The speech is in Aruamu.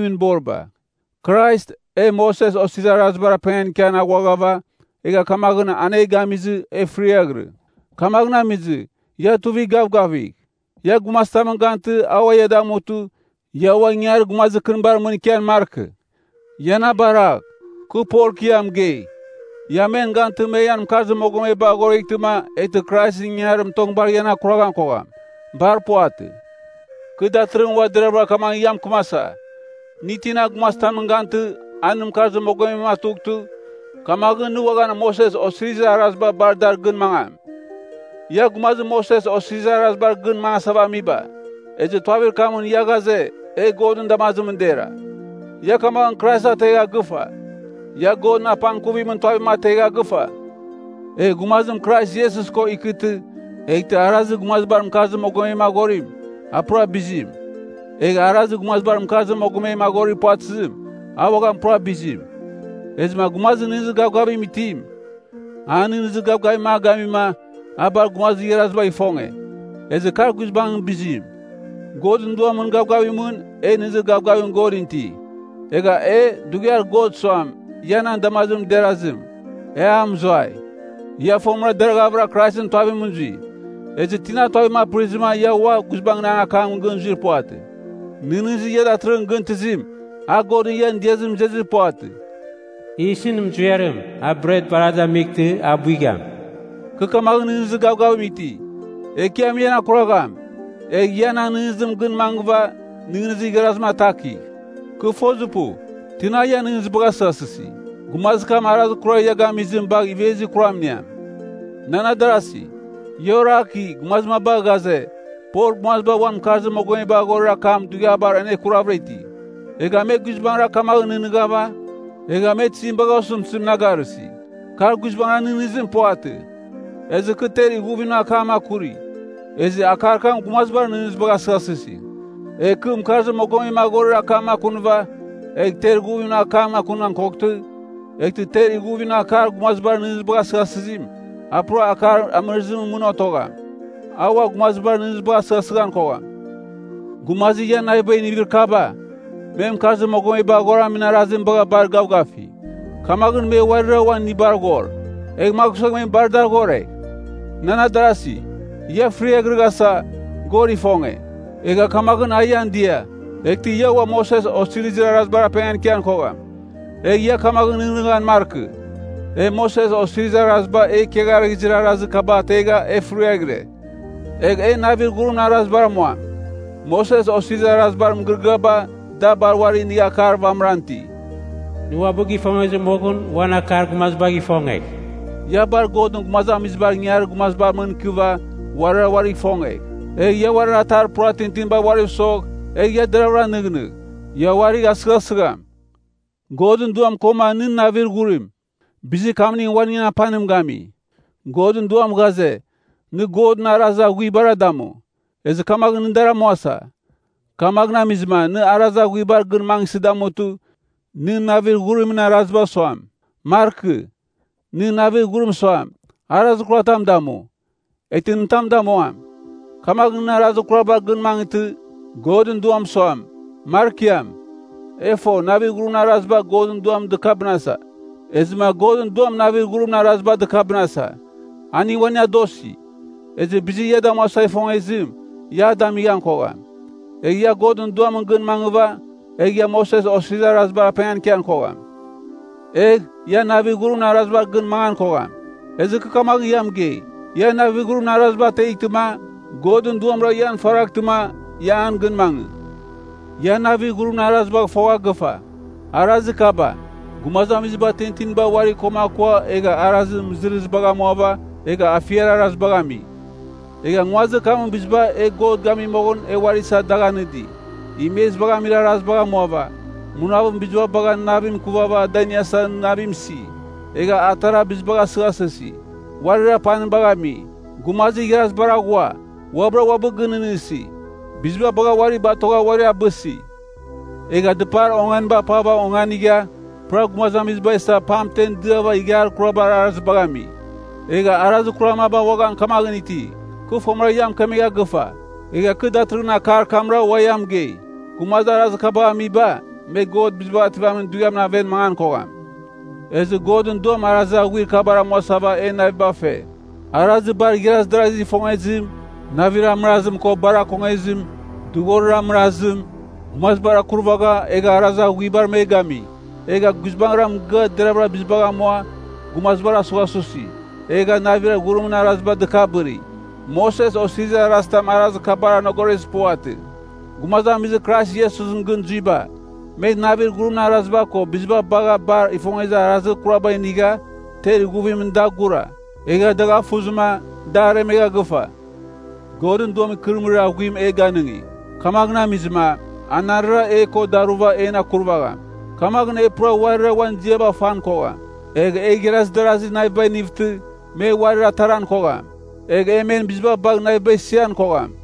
boriba. Krais, e Moses Osirizir Arazibar apengan ikian aghuaghava, egha kamaghɨn an e gamizɨ, e fɨriaghɨrɨ. Kamaghɨn amizɨ, ia tuivigh gavgavigh. Ia gumazitamɨn gantɨ, a ua ia damutɨ, ia ua ingangarir gumazir kɨnibar mɨn ikian markɨ. Ia na baragh. Kɨ Pol, kɨ ia mɨgei, ia men gantɨma me ian mɨkarzir mogomeba aghoreghtɨma, eghtɨ Kraisɨn ingangarim tong bar ian akuraghan kogham. Bar puvatɨ. Kɨ datɨrɨghɨn ua deravɨra kamaghɨn ia mɨkɨmasa, nɨ tina gumazitamɨn gantɨ, a nɨn mɨkarzir mogomem atughtɨ, kamaghɨn nɨ uaghan Moses Osirizir Araziba bar dar gɨn mangam. Ia gumazir Moses Osirizir Arazibar gɨn mangasava amiba, ezɨ tuavir kamɨn ia ghaze, e Godɨn damazimɨn dera, ia kamaghɨn Krais ategha gɨfa. Ia Godɨn apangkuvimɨn tuavim ategha gɨfa. Egh gumazim Krais Iesus ko ikɨtɨ, eghtɨ arazir gumazibar mɨkarzir mogomem aghorim, a pura bizim, egh arazir gumazibar mɨkarzir mogomem aghorir puvatɨzim, a uaghan pura bizim. Ezɨma gumazir nɨghnɨzir gavgavim itim, an nɨghnɨzir gavgavim a gamima, a bar gumazir igharazibagh ifonge, ezɨ kar guizbangɨn bizim. Godɨn Duamɨn gavgavimɨn, e nɨghnɨzir gavgavim Godɨn iti. Egha e, dughiar God suam, ia nan damazimɨn derazim, e a mɨzuai. Ia fomɨra deraghavɨra Kraisɨn tuavimɨn zui. Ezɨ tina tuavim apɨrizɨma ia ua guizbangɨn akamɨn gɨn zuir puvatɨ? Nɨghnɨzir ia datɨrɨghɨn gɨn tɨzim, a Godɨn ian diazimɨn izezir puvatɨ. Yisɨn muziarim, a bret bar a damightɨ, a buigham. Kɨ kamaghɨn nɨghnɨzir gavgavim iti, Ekiam ian akuragham. Egh ia nan nɨghnɨzimɨn gɨn mangɨva, nɨghnɨzir igharazim atakigh. Kɨ fozir pu, tina ian nɨghnɨzibagh asɨghasɨsi. Gumazir kam arazir kurar ia gamizim bagh ivezir kuram iniam. Nan adarasi, ia oraki, gumazir maba ghaze, Pol gumaziba uan mɨkarzir mogomeba aghorir akam dughiabar anekuravɨra iti. Egha me guizbangɨra kamaghɨn nɨghnɨva, egha me tizim bagha osɨmtɨzim na garɨsi? Kar guizbangɨra nɨghnɨzim puvatɨ. Ezɨ kɨ ter ighuvimɨn akam akuri, ezɨ akar kam gumazibar nɨghnɨzibagh asɨghasɨsi. Egh kɨ mɨkarzir mogomem aghorir akam akunɨva, egh ter ighuvimɨn akam akunan koghtɨ, eghtɨ ter ighuvimɨn akar gumazibar nɨghnɨzibagh asɨghɨsɨzim, a pura akar amɨrɨzimɨn mɨn otogham, a ua gumazibar nɨghnɨzibagh asɨghɨsɨghan kogham. Gumazir ian navibagh inivir kaba, me mɨkarzir mogomeba aghoramin arazim bagha bar gavgafi. Kamaghɨn me uarira uan inibar ghor, egh magh suegh bar dar ghoregh. Nan adarasi, ia fɨrighrasa, God ifonge, egha kamaghɨn a ian dia. Eghtɨ ia ua Moses Osirizir Arazibar apengan ikian kogham, egh ia kamaghɨn nɨghnɨghan markɨ, “E Moses Osirizir Araziba e ikiagharɨghɨzir arazir kaba ategha e fɨriaghɨre. Egh e navir ghurimɨn arazibar amuam.” Moses Osirizir Arazibar mɨgɨrɨgɨaba, da bar uari inigha akar vamɨran iti. “Nɨ uabɨ gifongezir moghɨn uan akar gumazibagh ifongegh.” Ia bar Godɨn gumazamizibar ingangarir gumazibar mɨn ikɨvɨ, uarira uarigh ifongegh. Egh ia uarir atar pura tintinibar uariv sogh, egh ia deravɨra nɨghnɨgh. Ia uarigh asɨghasɨgham. Godɨn Duam koma nɨn navir ghurim, bizir kamning uaningɨn apanimning gami. Godɨn Duam ghaze, nɨ Godɨn arazir aghuibara damu. Ezɨ kamaghɨn nɨ dar amuasa. Kamaghɨn amizɨma nɨ arazir aghuibar gɨn mangɨsɨ damutɨ, nɨn navir ghurimɨn araziba suam, markɨ. Nɨn navir ghurim suam, “Arazir kuratam damu.” Eghtɨ nɨ tam damuam. Kamaghɨn nɨ arazir kurabar gɨn mangɨtɨ, Godɨn Duam suam, markiam. E fo, navir ghurimɨn araziba Godɨn Duam dɨkabɨnasa. Ezɨma Godɨn Duam navir ghurimɨn araziba dɨkabɨnasa. Aning uaning adosi. Ezɨ bizir ia damuasa ifongezim, ia a damighan kogham. Egh ia Godɨn Duamɨn gɨn mangɨva, egh ia Moses Osirizir Arazibar apengan ikian kogham. Egh, ia navir ghurimɨn arazibar gɨn mangan kogham. Ezɨ kɨ kamaghɨn ia mɨgei, ia navir ghurimɨn araziba ateghtɨma, Godɨn Duamra ian faraghtɨma, ia an gɨn mangɨ. Ia navir ghurimɨn arazibagh fogha gɨfa. Arazir kaba, gumazamiziba tintinibar uari koma akua egha arazir mɨzɨrzibagh amuava, egha afiar arazibagh ami. Egha nguazir kamɨn biziba e God gami moghɨn e uari isa dagh anɨdi, imezibagh amir arazibagh amuava, munavɨn biziba bagha navim ikuvighava da iniasa navim isi. Egha atara bizibagh asɨghasɨsi, uarir apanibagh ami, gumazir igharazibar aghua, uabɨra uabɨ gɨnɨghnɨsi, biziba bagha uari batogha uari abɨsi. Egha dɨpar onganiba apava onganigha, pura gumazamiziba isa pamtemɨn diava ighiar kurabar arazibagh ami. Egha arazir kurar maba uaghan kamaghɨn iti. Kɨ fomɨra ia mɨkemegha gɨfa. Egha kɨ datɨrɨghɨn akar kamra ua ia mɨgei. Gumazir arazir kabagh amiba, me God Bizibagh Ativamin Dughiamɨn aven mangan kogham. Ezɨ Godɨn Duam arazir aghuir kabar amuasava en naviba fe: arazir bar igharaz darazigh ifongezim, navir amɨrazim ko bar akongezim, dughorir amɨrazim, gumazibar akurvagha, egha arazir aghuibar me gami. Egha guizbangɨra mɨgɨa deravɨra bizibagh amua, gumazibar asughasusi, egha navir ghurimɨn araziba dɨkabɨri. Moses Osirizir Arazitam arazir kabar anegoroghezir puvatɨ. Gumazamizir Krais Iesusɨn gɨn zuiba, me navir ghurimɨn araziba ko biziba bagha bar ifongezir arazir kuraba inigha, ter ighuvimɨn da gura. Egha dagh afuzɨma, da aremegha gɨfa. Godɨn Duam ikɨrɨmɨrir aghuim e ganɨngi. Kamaghɨn amizɨma, anarɨra e ko daruva en akurvagham. Kamaghɨn e pura uarira uan ziaba fan kogham. Egh e igharaz darazir navibagh inivtɨ, me uarir ataran kogham. Egh e men biziba bagh naviba isian kogham.